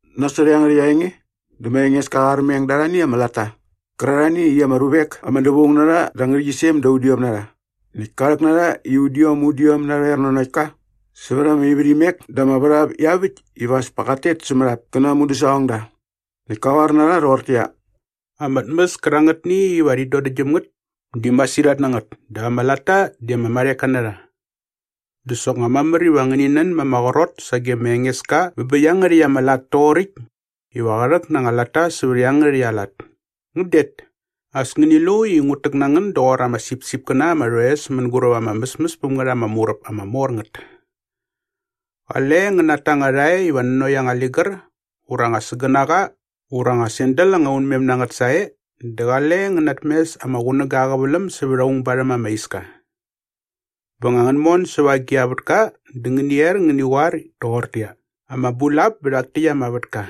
Nasot iangärhäkt aa enge dä ma Engeska qa armeng da arhani ama latta qärarhani i ama ruvek ama dävaung na rha da ama ngärhäqyisem da udiom na rha näkt ka rhäk na rha i udiom udiom narhoer nanokt ka sävät ama ivärhimek dä ama värhap iaväkt iva as pa qat tet sämät ap kä na aa mudäsaqongda. Näkt kä qoar na rha rhoqortäqyia, “Ama tmäs kärangätni iva rhi dodäktgyäm ngät di masirhat na ngät dap ama latta di ama marheka na rha. Dä soknga mamär iva ngäni nän ma ama qrot sage ma Engeska bä bä iangärhäkt ama lat toqoräkt iva qä rhäk na anga latta sävät iangärhäkt aa lat. Ngän det! As ngäni lu i ngut täk na ngän doqor ama sipsipkäna ama rhoes mänguräp ama mäsmäs päm ngät ama muräp ama mor ngät. Qale ngän nata anga rhae iva nanokt anga ligär ura anga sägänaqa ura anga sandal anga unmem na ngät sae dä qale ngän natmes ama qunäga aa qäväläm sävät aung barhäm ama iska.” “Bä nga ngän mon säva agi a vätka dä ngäni er ngäni qoar toqortäqyia, ‘Ama bulap bä rhak täkt ama vätka.’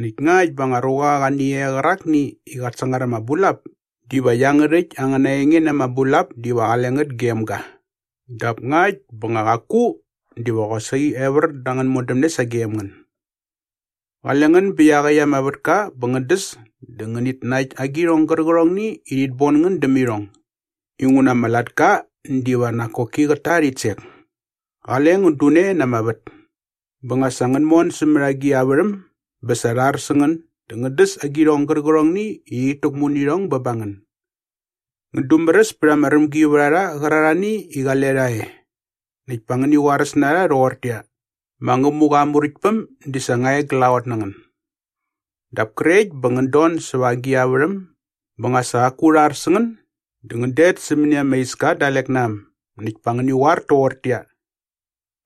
Näkt ngakt bä anga ruqa qa ni e qärakni i qat sangar ama bulap diva iangärhäkt angäna enge na ama bulap diva qale ngät gem ga dap ngakt bä nga qaku diva qosaqi evär dä angän modämne sagem ngän. Qale ngän bä iaqäkt ama vätka bä ngän däs dä ngänit nakt agirhong gärqärhongni i rhit bon ngän däm irhong inguna ama latka diva nak koki qät ta aa rhitsek. Qale ngän dune na ama vät.” “Bä nga sa ngän mon sämät agi a värhäm bä sa rha ar sä ngän dä ngän däs agirhong gärqärhongni i rhit täkmu nä irhong bä ba ngän. Ngän dumäräs pät ama rämgivärharha qärarhani i qale rha e näkt pa ngäni qoaräs na rha rhoqortäqyia, ‘Ma Ngämuqa aa Muräktpäm di sa nga e glaqot na ngän.’ “Dap krekt bä ngän don säva agi a värhäm bä nga sa qaku rha ar sä ngän dä ngän det sämäni ama iska dalek na äm näkt pa ngäni qoar toqortäqyia,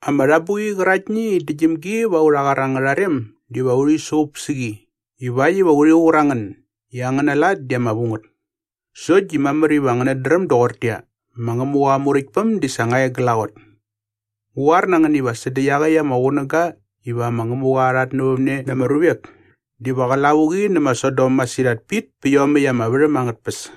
‘Ama rhabuqi qäraktni i dädäktgyäm gi va aurha qar angärha rem diva urhi suqup sä qi ivakt iva urhi qur a ngän i angäna lat di ama vu ngät. Sokt di mamär iva ngänät dräm doqortäqyia, ma Ngämuqa aa Muräktpäm di sa nga e glaqot.’ Ngu qoar na ngän iva sädä iaqäkt ama qunäga iva ma Ngämuqa qa rhatnävämne na ama ruvek diva qä lavuqi nä ma Saidon masirhat pit pä iomäkt ama värhäm angät tpäs.”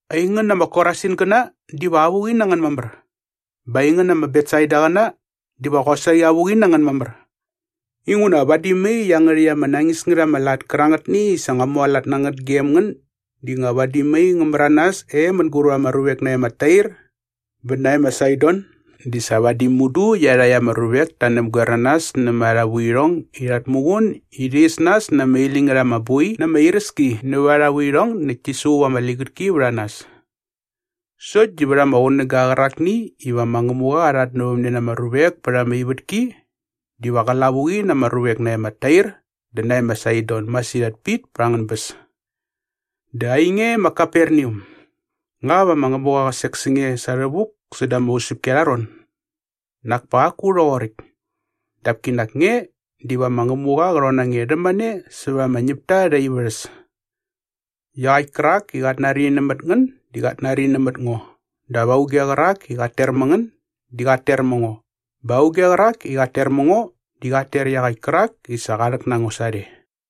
“Aingän ama Korasingäna diva avuqi na ngän mamär! Bä aingän ama Betsaidaqäna diva qosaqi avuqi na ngän mamär! Inguna vadi mai iangärhäkt ama nañis ngät ama lat kärangätni i sa ngua mualat na ngät gem ngän di nga vadi mai ngä märanas e mänguräp ama ruvek nae ma Tair bä nae ma Saidon di sa vadi mudu iarhakt ama ruvek ta näpgoer na nas nämät arha vuirhong i rhat muqun i rhi is nas na ama iläñ ngät ama boi na ama iräski nävät arha vuirhong näkt ti suqup ama ligätki vät a nas. Sokt di vät ama qunäga qärakni iva ma Ngämuqa qa rhatnävämne na ama ruvek pät ama ivätki diva qä lavuqi na ama ruvek nae ma Tair dä nae ma Saidon masirhat pit pa angän bäs. Dä ainge ma Kaperneam, nga va ma Ngämuqa qä sek sä nge sa rhävuk säda ama usäpki arha ron? Nak pa qaku rhoqoräkt. Dap kinak nge diva ma Ngämuqa qä rhon na nge rhämane sävät ama ñäpta arhä ivärhäs.” “Iaqäkt kärak i qat nari nämät ngän di qat nari nämät ngo dap auge qärak i qat ter mä ngän di qat ter mä ngo bä auge qärak i qat ter mä ngo di qat ter iaqäkt kärak i sa qa rhäk na ngo sarhe.”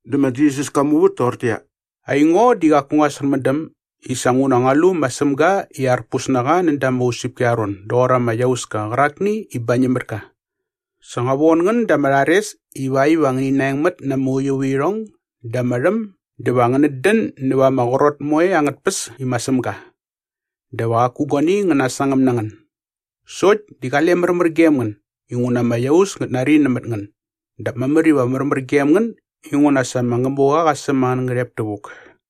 Dä ma Jisas ka muvät toqortäqyia, “Aingo di qaku ngua särmändäm i sa nguna ngua lu ma Sämga i arpus na qa näda ama usäpki arha ron doqor ama iauska qärakni i bañäm mät ka. Sa ngua von ngän da ama rhares ivakt iva ngäni naengmät na ama uiuvärhirhong dä ama rhäm dä va ngänät dän näva ama qrot moe angät tpäs i ma Sämga. Dä va qaku guani ngä nasangäm na ngän. Sokt di qale märmär gem ngän inguna ama iaus ngät nari nämät ngän dap mamär iva märmär gem ngän inguna sa ma Ngämuqa qa säm angän ngärhep tävuk.”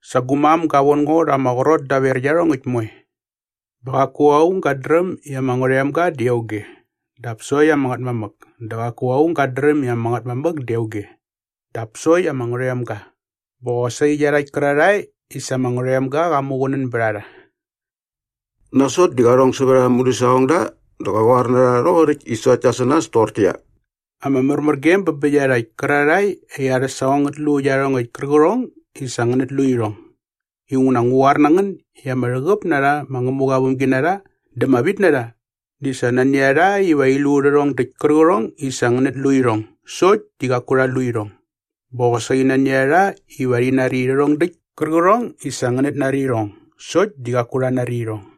“Sa gu mam ga von ngo rha ama qrot daver iarhongäkt moe. Bä qaku aung gat dräm i ama Ngärhoemga di auge dap sokt ama Ngätmamäk dä qaku aung gat dräm i ama Ngätmamäk di auge dap sokt ama Ngärhoemga bä qosaqi iarhakt kärarhae i sa ama Ngärhoemga qa muqunäga sä qa ba rha.” Nasot dä qa rhong sävät aa mudäsaqongda dä qa qoar na rha rhoqoräkt i sokt ta sä nas toqortäqyia, “Ama märmärgem bä bä iarhakt kärarhae i arhä saqong ngät lu iarhongäkt kärqärhong i sa ngänät lu irhong. Inguna ngu qoar na ngän i ama rhäqäp na rha ma Ngämuqa aa vämginarha dä ama vitnarha di sa nani a rha iva rhi lu rhärhong däkt kärqärhong i sa ngänät lu irhong sokt di qaku rha lu irhong. Bä qosaqi nani a rha iva rhi nari rhärhong däkt kärqärhong i sa ngänät nari irhong sokt di qaku rha nari irhong.”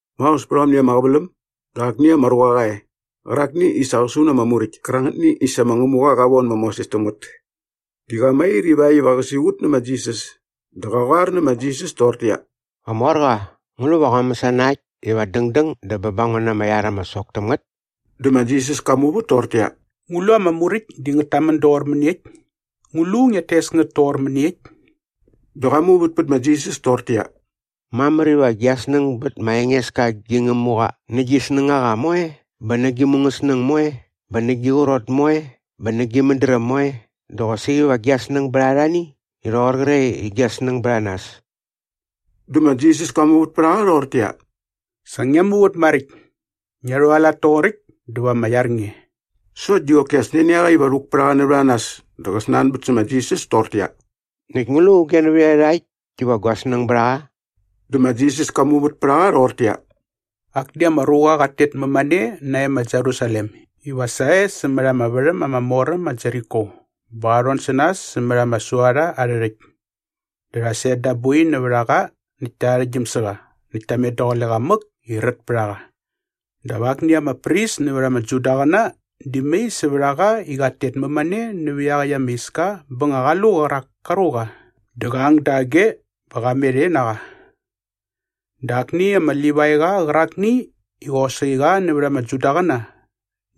Maos pät aomni ama qäväläm dä akni ama ruqa qa e qärakni i sa qa su na ama Muräkt kärangätni i sa ma Ngämuqa qa von ma Moses täm ngät. Di qa mair ivakt iva qä siqut nä ma Jisas dä qa qoar nä ma Jisas toqortäqyia, “Qamorqa, ngu lu va ngua mäsana äkt iva dängdäng dä bä ba ngo na ama iar ama sok täm ngät?” Dä ma Jisas ka muvät toqortäqyia, “Ngu lu ama Muräkt di ngät tamän doqor mäniekt? Ngu lu ngiat tes ngät toqor mäniekt?” Dä qa muvät pät ma Jisas toqortäqyia, “Mamär iva gia snäng bät ma Engeska gi Ngämuqa nä gi snängaqa moe bä nä gi mungäsnäng moe bä nä gi qrot moe bä nä gi mädräm moe dä qosaqi va gia snäng bät arhani i rhoqor qre i gia snäng bät a nas.” Dä ma Jisas ka muvät pät a qa rhoqortäqyia, “Sa ngia muvät maräkt. Ngia rhualat toqoräkt dä va ama iar nge.” Sokt di qoki as nani a qa iva rhuk pät a qa nävät a nas dä qa snanbät sä ma Jisas toqortäqyia, “Näkt ngu lu auge nävät iarhakt diva gua snäng bät a qa?” Dä ma Jisas ka muvät pät a qa rhoqortäqyia, “Akni ama ruqa qat tet mämane nae ma Jerusalem iva sae sämät ama värhäm ama mor äm ma Jeriko bä qa rhon sä nas sämät ama suarha arhä rhäkt. Dä rha set da aa boi nävät a qa näkt ta arhäktgyäm sä qa näkt ta met daqule qa mäk i rät pät a qa. “Dap akni ama pris nävät ama Judaqäna di mai sävät a qa i qat tet mämane nävä iaqäkt ama iska bä nga qa lu qärak ka ruqa dä qa ang dage bä qa met e na qa. Dä akni ama Livaiqa qärakni i qosaqi qa nävät ama Judaqäna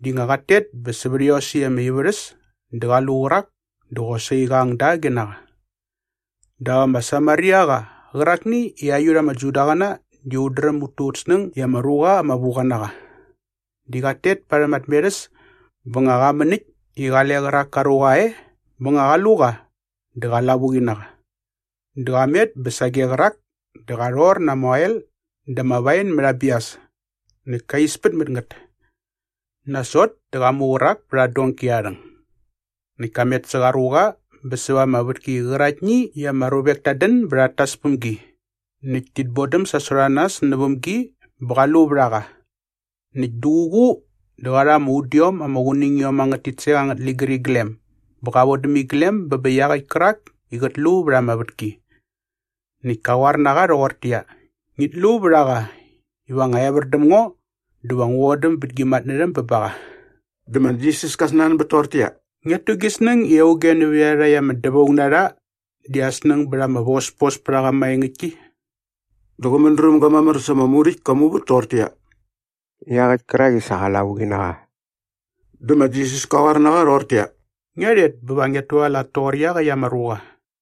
di nga qat tet bä sävät iosäkt ama ivärhäs dä qa lu qärak dä qosaqi qa ang dage na qa. “Dap ama Samariaqa qärakni i aiut ama Judaqäna di ut dräm ut tu ut snäng i ama ruqa ama vu qa na qa di qat tet parhäm aa tmerhäs bä nga qa män äkt i qale qärak ka ruqa e bä nga qa lu qa dä qa lavuqi na qa. Dä qa met bä sage qärak dä qa rhor na ama oel dä ama wain mät aa bias näkt ka ispät mät ngät. Nasot dä qa mu qärak pät aa donki aa rhäng. Näkt ka met sä qa ruqa bä säva ama vätki qäraktni i ama ruvek tat dän bä rhat tas päm gi näkt tit bodäm sasot a nas näväm gi bä qa lu vät a qa. Näkt duququ dä qa rha ama udiom ama qunängiom angät titsek angät ligäriglem bä qa vodäm iglem bä bä iaqäkt kärak i qät lu vät ama vätki. Näkt ka qoar na qa rhoqortäqyia, ‘Ngit lu vät a qa iva nga evär däm ngo dä va ngu vodäm bät gi matnärhäm bä ba qa.’” Dä ma Jisas ka snanbät toqortäqyia, “Ngiat tu gi snäng i auge nävät iarhakt ama dävaung na rha di aa snäng bät ama vospospärhaqa maengäktki?” Dä qä mädrämga mamär sa ama Muräkt ka muvät toqortäqyia, “Iaqäkt kärak i sa qa lavuqi na qa.” Dä ma Jisas kä qoar na qa rhoqortäqyia, “Ngia rhet bä va ngiat tualat toqor iaqäkt ama ruqa.”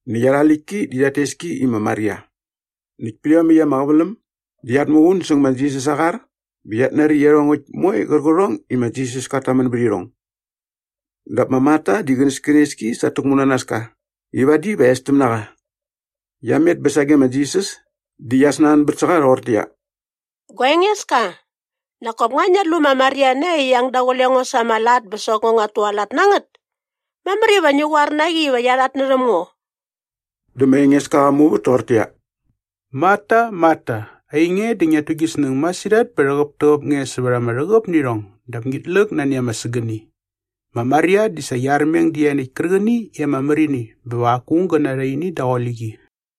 Näkt arha läktki di rhat tes ki i ma Maria. Näkt pät iomäkt ama qäväläm di qiat muqun säng ma Jisas aa qar bä qiat nari iarhongäkt moe qärqärhong i ma Jisas kat tamän bät irhong. Dap ma Marta di qänäskänes ki sa at täkmunanaska i vadi va estäm na qa. Qia met bä sage ma Jisas di qia snanbät sä qa rhoqortäqyia, “Gua Engeska, nak kop nga ngiat lu ma Maria nae i qia ang daqule ngo sa ama lat bä sokt ngo nguat tualat na ngät? Mamär iva ngi qoar na qi iva qia rhatnärhäm ngo.” Dä ma Engeska qa muvät toqortäqyia, “Marta, Marta, ainge di ngiat tu gi snäng masirhat bä rhäqäptäqäp nge sävät ama rhäqäp nä irhong dap ngit läk nani ama sägäni. Ma Maria di sa qia armeng dä ianiäkt kärqäni i ama mär ini bä va qaku aung gä narha ini daqule qi.”